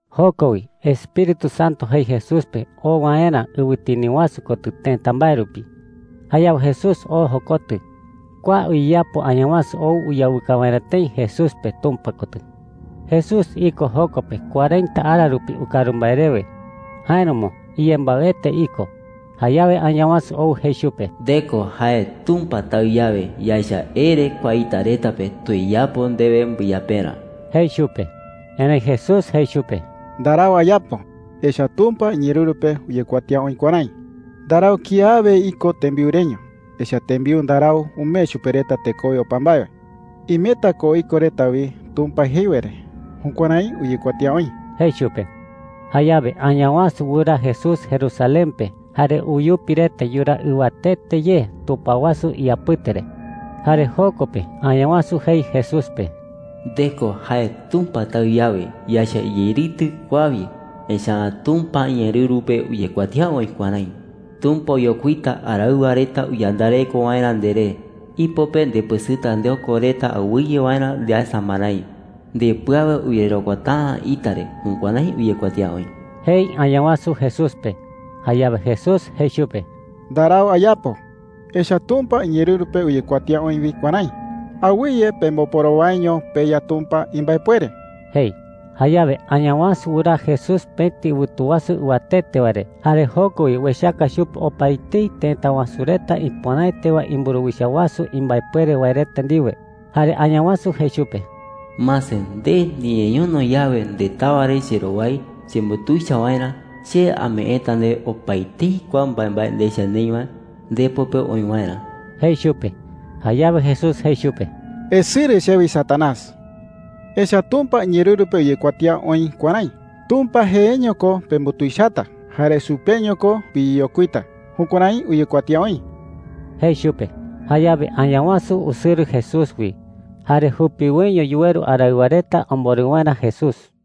Joko wi Espíritu Santo jei Jesús pe oo waerä ɨwɨtini wasu kotɨ tëta mbae rupi. Jayawe Jesús oo jokotɨ. Kua uyeyapo Añawasu ou uyawɨka waerä tëi Jesús pe Tumpa kotɨ. Jesús iko joko pe cuarenta ara rupi ukaru mbae rewe. Jáeramo iyembaɨete iko. Jayawe Añawasu ou jei chupe: “Nde ko jae Tumpa Taɨ yawe, yaecha ere kua ita reta pe tuyeyapo ndewe mbɨyaperä,” jei chupe. Erëi Jesús jei chupe: “Ndarau ayapo. Echa’ä Tumpa iñeerɨru pe uyekuatía oï kuärái: ‘Ndarau kiawe iko tembiu reño. Echa’ä tembiu ndarau umee chupe reta tekowe opa mbae wae. Imeta ko iko reta wi Tumpa jei wae re.’ Jukuärái uyekuatía oï,” jei chupe. Jayawe Añawasu wɨraa Jesús Jerusalén pe jare uyupi reta yuraa ɨwatete ye tupao wasu iyapɨte re. Jare joko pe Añawasu jei Jesús pe: “Nde ko jae Tumpa Taɨ yawe, yaecha iyeritɨ kua wi. Echa’ä Tumpa iñeerɨru pe uyekuatía oï kuärái: ‘Tumpa oyokuita araɨwa reta uyandareko waerä nderé. Ipo pe ndepɨsɨta ndeoko reta awɨye waerä ndeasa marái. Ndepɨ awe uyererokuata’ä ita re.’ Jukuärái uyekuatía oï,” jei Añawasu Jesús pe. Jayawe Jesús jei chupe: “Ndarau ayapo. Echa’ä Tumpa iñeerɨru pe uyekuatía oï wi kuärái: ‘Awɨye pemboporowaiño peYa Tumpa imbaepuere,’ jei,” jei chupe. Jayawe Añawasu wɨraa Jesús pëti ɨwɨtu wasu ɨwatete wae re jare joko wi uechaka chupe opaetei tëta wasu reta ipöraete wae imburuwicha wasu imbaepuere wae reta ndiwe. Jare Añawasu jei chupe: “Mase, nde niñeñono yawe ndetawa re cherowai chembutuicha waerä, che ameeta ndewe opaetei kua mbaembae ndecha neï wae ndepo pe oï waerä,” jei chupe. Jayawe Jesús jei chupe: “Esɨrɨ chewi, Satanás. Añawasu jee ko Satanás. Echa’ä Tumpa iñeerɨru pe uyekuatía oï kuärái: ‘Tumpa jeeño ko pembutuichata, jare chupeño ko piyeyokuita.’ Jukuärái uyekuatía oï,” jei chupe. Jayawe Añawasu usɨrɨ Jesús wi, jare jupiwoiño yuweru araɨwa reta omborɨ waerä Jesús.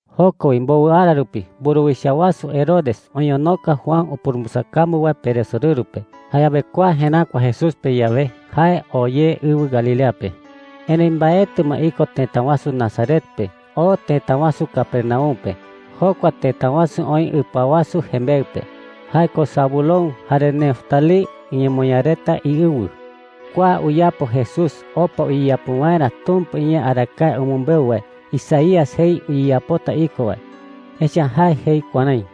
Joko wi mbowɨ ara rupi, mburuwicha wasu Herodes oñonoka Juan upurumbɨsakambu wae peresorɨru pe. Jayawe kua jeräkua Jesús pe yawe, jae oo ye ɨwɨ Galilea pe. Erëi mbaetɨ ma iko tëta wasu Nazaret pe. Oo tëta wasu Capernaum pe. Jokua tëta wasu oï ɨpa wasu jembeɨ pe – jae ko Zabulón jare Neftalí iñemoñaa reta iɨwɨ. Kua uyapo Jesús opa uyeyapo waerä Tumpa iñee arakae umɨmbeu wae Isaías jei uyeyapota iko wae. Echa’ä jae jei kuärái: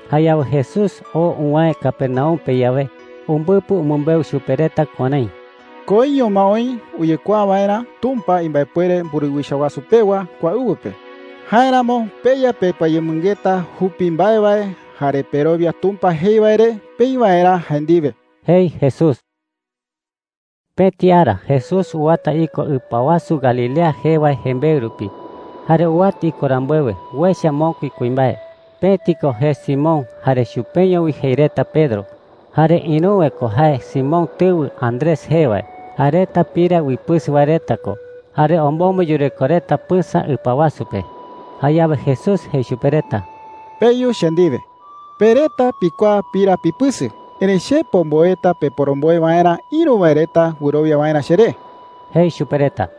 Jayawe Jesús oo uwäe Capernaum pe yawe, umbɨpɨ umɨmbeu chupe reta kuärái: “Koiño ma oï uyekuaa waerä Tumpa imbaepuere mburuwicha wasu pewa kua ɨwɨ pe. Jáeramo peya pepɨayemɨngeta jupi mbae wae jare perowia Tumpa jei wae re peï waerä jae ndiwe,” jei Jesús. Pëti ara Jesús uwata iko ɨpa wasu Galilea jee wae jembeɨ rupi. Jare uwata iko rambuewe, uecha mokui kuimbae. Pëti ko jee Simón, jare chupeño wi jei reta Pedro. Jare ïruwe ko jae Simón tɨwɨ Andrés jee wae. Jae reta pira uipɨsɨ wae reta ko, jare omombo yureko reta pɨsa ɨpa wasu pe. Jayawe Jesús jei chupe reta: “Peyu che ndiwe,” jei. “Pe reta pikuaa pira pipɨsɨ, erëi che pomboeta peporomboe waerä, ïru wae reta wɨrowia waerä cheré,” jei chupe reta.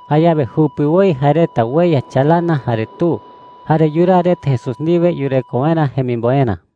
Jayawe jupiwoi jae reta ueya chalana jare tu, jare yuraa reta Jesús ndiwe yureko waerä jemimboerä.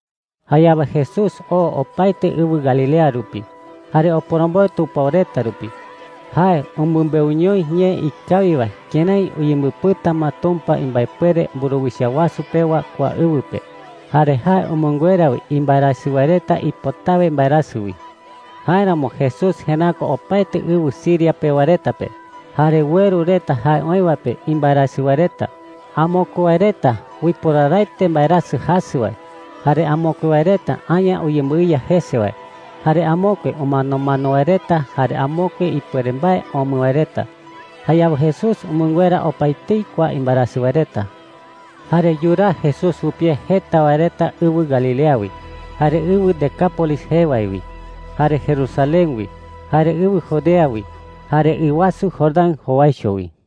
Jayawe Jesús oo opaete ɨwɨ Galilea rupi, jare oporomboe tupao reta rupi. Jae umɨmbeuñoi ñee ikawi wae kërái uyembɨpɨta ma Tumpa imbaepuere mburuwicha wasu pewa kua ɨwɨ pe. Jare jae umɨnguera wi imbaerasɨ wae reta ipotawe mbaerasɨ wi. Jáeramo Jesús jeräkua opaete ɨwɨ Siria pewa reta pe. Jare ueru reta jae oï wae pe imbaerasɨ wae reta. Amokue wae reta uiporaraete mbaerasɨ jasɨ wae, jare amokue wae reta aña uyembɨiya jese wae, jare amokue umanomano wae reta, jare amokue ipuere mbae omɨ wae reta. Jayawe Jesús umɨnguera opaetei kua imbaerasɨ wae reta. Jare yuraa Jesús jupie jeta wae reta ɨwɨ Galilea wi, jare ɨwɨ Decápolis jee wae wi, jare Jerusalén wi, jare ɨwɨ Judea wi, jare ɨ wasu Jordán jowaicho wi.